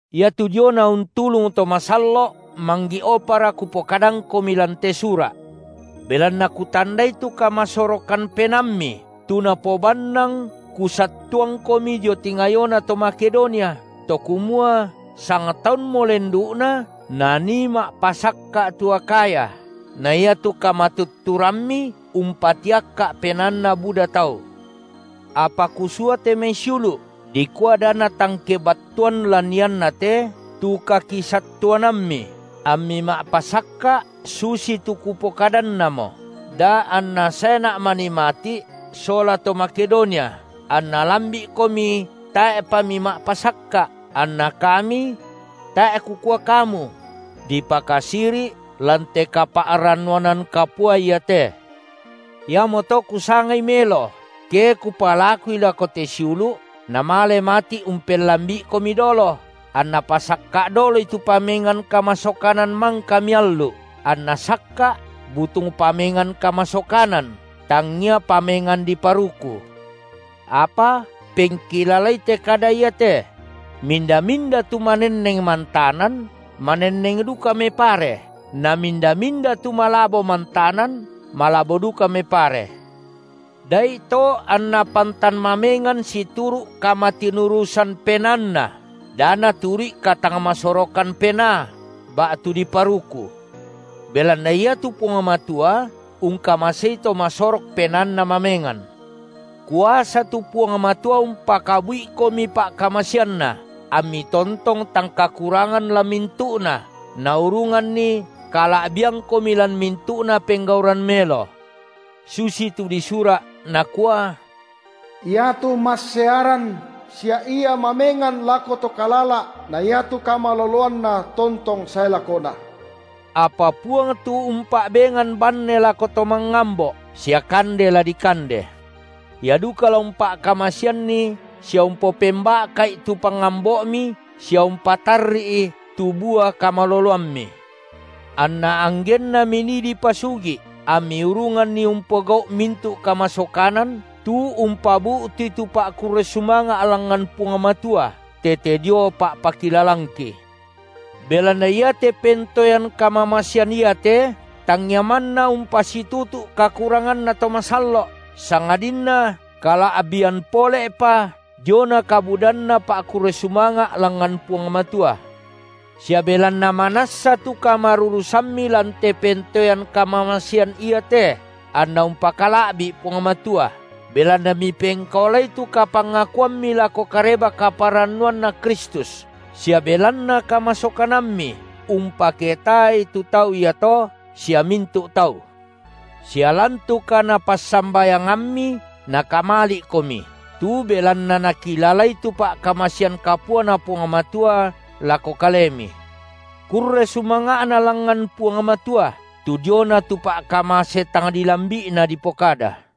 Iatu diona untulung to masallo’ manggi’opara kupokadangkomi lan te sura’. Belanna kutandai tu kamasorokan penaammi tu napobannang kusattuangkomi dio tingayona to Makedonia, to kumua sangtaunmo lendu’na nanii ma’pasakka’ tu Akhaya, na iatu kamatutturammi umpatiakka’ penaanna buda tau. Apa kusua te mai siulu’ dikua da natang kebattuan lan iannate tu kakisattuanammi, ammi ma’pasakka’ susitu kupokadannamo, da anna saena’ manii mati’ sola to Makedonia, anna lambi’komi tae’pa mima’pasakka’, anna kami – tae’ kukua kamu – dipakasiri’ lan te kapa’rannuanan kapua iate. Iamoto kusangai melo, ke kupalakui lako te siulu’, namale mati’ umpellambi’ikomi dolo, anna pasakka’ doloi tu pamengan kamasokanan mangka miallu’, anna sakka’ butung pamengan kamasokanan tangngia pamengan diparuku. Apa pengkilalai te kada iate: Minda-minda tu manenneng mantanan, manenneng duka mepare, na minda-minda tu malabo mantanan, malabo duka mepare. Da’ito anna pantan mamengan situru’ kamatinurusan penaanna, da naturu’i katangmasorokan penaa ba’tu diparuku. Belanna iatu Puang Matua ungkamasei to masorok penaanna mamengan. Kuasa tu Puang Matua umpakabu’ikomi pa’kamaseanNa, ammi tontong tang kakurangan lan mintu’na, naurunganni kala’biangkomi lan mintu’na penggauran melo. Susitu disura’, nakua: Iatu massearan, sia Ia mamengan lako to kalala’, na iatu kamaloloanNa tontong sae lakona. Apa Puang tu umpa’bengan banne lako to mangambo’ sia kande la dikande. Ia duka la umpa’kamaseanni sia umpopemba’ka’i tu pangambo’mi sia umpatarri’i tu bua kamaloloammi, anna anggenna minii dipasugi’ ammi urunganni umpogau’ mintu’ kamasokanan, tu umpabu’tui tu pa’kurre sumanga’ langngan Puang Matua tete dio pa’pakilalangki. Belanna iate pentoean kamamasean iate tangngia manna umpasitutu’ kakuranganna to masallo’, sangadinna kala’bian pole’pa diona kabudanna pa’kurre sumanga’ langngan Puang Matua. Sia belanna manassa tu kamarurusammi lan te pentoean kamamasean iate anna umpakala’bi’ Puang Matua, belanna mipengkaolai tu kapangakuammi lako Kareba-kaparannuanNa Kristus, sia belanna kamasokanammi umpaketaai tu tau iato sia mintu’ tau. Sia lan tu kanapassambayangammi nakamali’komi, tu belanna nakilalai tu pa’kamasean kapuaNa Puang Matua lako kalemi. Kurre sumanga’na langngan Puang Matua, tu diona tu pa’kamase tang dilambi’Na dipokada.